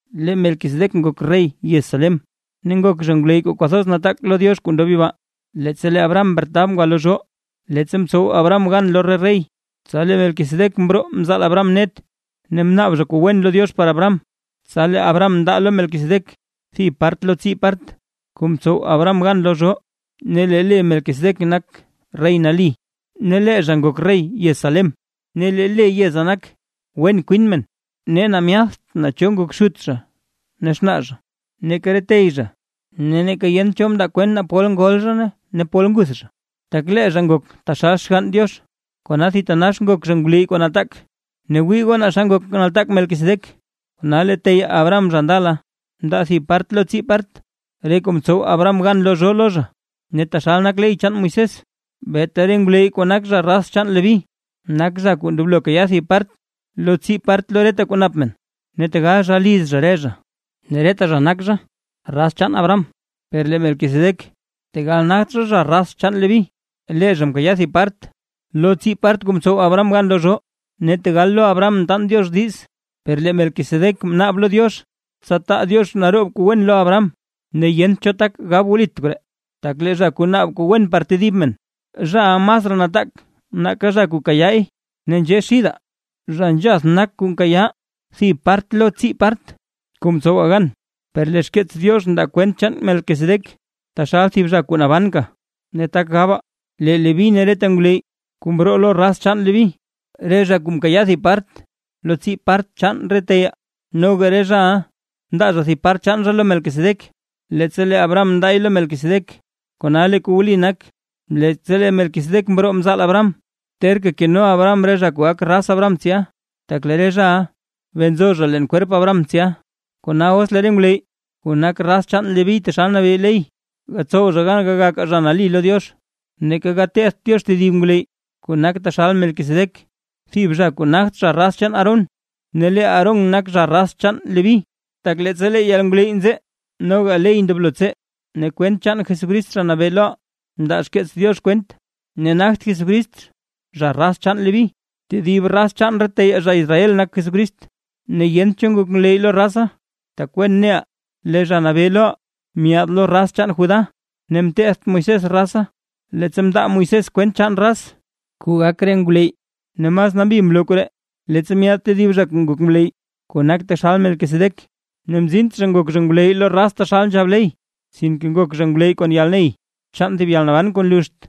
Lee Melquisedec ngok rey yez Salem, ne ngok zha ngwleyy kuu kwathoz nataak lo Diox kuu ndob yibaa. Leettsa lee Abraham mretab ngwa lo zhoo, leettsa mtsow Abraham gan lo re rey, tsa lee Melquisedec mroo mzaal Abraham net, ne mnaab zha kuu wen lo Diox par Abraham, tsa lee Abraham mndaa lo Melquisedec thib part lo tsii part, kuu mtsow Abraham gan lo zhoo. Ne lee le Melquisedec nak “rey nali”; ne lee zha ngok rey yez Salem, ne lee le yeza nak, “wen kwin men”. Ne myatht naa cho ngok xut zha ne xnaa zha, neeka re tey zha; ne neeka yent cho mndaa kwent naa pol ngol zha ne pol nguth zha; tak lee zha ngok taxal Xgann Diox, kona thitanax ngok zha ngwleyy kuu nataak. Ne wii goo naa xa ngok nataak Melquisedec, kona lee teyaa Abraham zha ndala mndaa thib part lo tsii part re kuu mtsow Abraham gan lo zhoo lo zha. Ne taxal nak ley chaan Moisés, beeta re ngwleyy kuu nak raz chaan Leví, nak zha kuu ndoblo kayaa thib part lo tsii part lo reta kuu nap men, ne tegal zha liz zha re zha, ne reta zha nak zha raz chaan Abraham. Per lee Melquisedec tegal nagt zha, zha raz chaan Leví, lee zha mkayaa thib part lo tsii part kuu mtsow Abraham gan lo zhoo, ne tegal lo Abraham mtaan Diox diiz, per lee Melquisedec mnaab lo Diox, tsa taa Diox naroob kuu wen lo Abraham. Ne yent cho tak gab wlit koree, tak lee zha kuu naab kuu wen par tedib men, zhaʼa masraa nataak nake zha kuu kayaay. Ne nzhee xidaa, zha nzhath nak kuu nkayaa thib part lo tsii part kuu ntsowaa gan, per lee xkeets Diox ndaa kwent chaan Melquisedec, taxal thib zha kuu nabanka. Ne tak gabaa, lee Leví ne reta ngwleyy kuu mroo lo raz chaan Leví, re zha kuu mkayaa thib part lo tsii part chaan re teyaa, noga re zhaʼa mndaa zha thib part chaan zha lo Melquisedec, leettsa lee Abraham mndaay lo Melquisedec; kona lee kuu wli nak, leettsa lee Melquisedec mroo mzaal Abraham, terka keno Abraham re zha kuu gak raz Abraham tsya, tak lee re zhaʼa bee nzo zha leen kwerp Abraham tsya. Kona os lee re ngwleyy kuu nak raz chaan Leví taxal nabee ley, gatsow zha gan gagakaa zha nali lo Diox, neeka gatetht Diox tedib ngwleyy kuu nak taxal Melquisedec, thib zha kuu nagt zha raz chaan Aarón, ne lee Aarón nak zha raz chaan Leví. Tak leettsa lee yalngwleyy nzee, noga ley ndoblo tsee. Ne kwent chaan Jesucrist Zha Nabee loʼaa ndaa xkeets Diox kwent, ne nagt Jesucrist, zha raz chaan Leví; tedib raz chaan re teyaa zha Israel nak Jesucrist, ne yent cho ngok ngwleyy lo raza. Tak wen neʼaa, lee Zha Nabee loʼaa myaad lo raz chaan Judá, ne mtetht Moisés raza, leettsa mndaa Moisés kwent chaan raz kuu gak re ngwleyy. Ne mas nambi mloo koree, leettsa myaad tedib zha kuu ngok ngwleyy, kuu nak taxal Melquisedec, ne mzint zha ngok zha ngwleyy lo raz taxal nzhab ley, sinke ngok zha ngwleyy kon yalney chaan thib yalnaban kuu nluxt.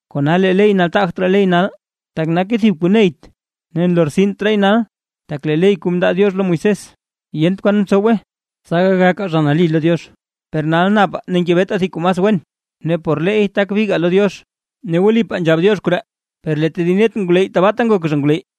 Kona lee ley nataagt raa ley nal, tak nake thib kuu neyt ne nlortsint raay nal, tak lee ley kuu mndaa Diox lo Moisés, yent kwan mtsowe tsa gagakaa zha nali lo Diox. Per nal napaa ne ngebetaa thib kuu mas wen, ne por leey tak bigaa lo Diox. Ne wlipaa nzhab Diox koree, per lee tedib net re ngwleyy tabaata ngok zha ngwleyy.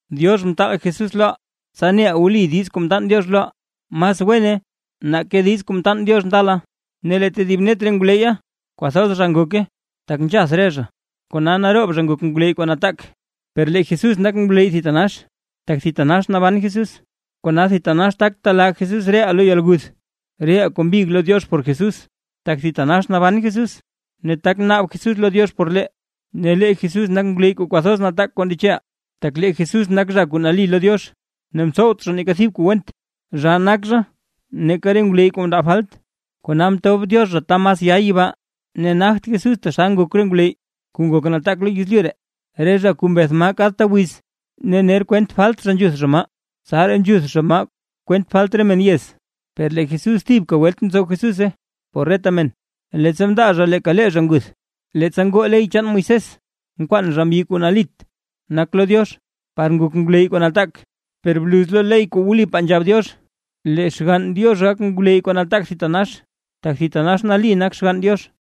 Diox mtaal Jesús loʼaa, tsa neʼaa wli diiz kuu mtaan Diox loʼaa, mas wene nake diiz kuu mtaan Diox ndala. Ne lee tedib net re ngwleyya kwathoz zha ngoke, tak nzhath re zha kona naroob zha ngok ngwleyy kuu nataak; per lee Jesús nak ngwleyy thitanax, tak thitanax naban Jesús. Kona thitanax tak telaa Jesús reʼaa lo yalguth, reʼaa kuu mbig lo Diox por Jesús, tak thitanax naban Jesús ne tak naab Jesús lo Diox por lee. Ne lee Jesús nak ngwleyy kuu kwathoz nataak kuu ndecheʼaa. Tak lee Jesús nak zha kuu nali lo Diox, ne mtsowt zha neeka thib kuu went, zhaa nak zha nake re ngwleyy kuu mndaa falt, kona mtob Diox zha ta mas ya yibaa. Ne nagt Jesús taxal ngok re ngwleyy kuu ngok nataak lo yezlyu ree, re zha kuu mbeth maa kadta wiz, ne ner kwent falt zha nzhuth zha maa, tsaraa nzhuth zha maa kwent falt re men yez. Per lee Jesús thibka welt mtsow Jesúse por reta men, leettsa mndaa zha leeka lee zha nguth. Leettsa ngoo ley chaan Moisés mkwaan zha mbyi kuu nalit nak lo Diox; par ngok ngwleyy kuu nataak, per bluz lo ley kuu wlipaa nzhab Diox, lee Xgann Diox gak ngwleyy kuu nataak thitanax, tak thitanax nali nak Xgann Diox.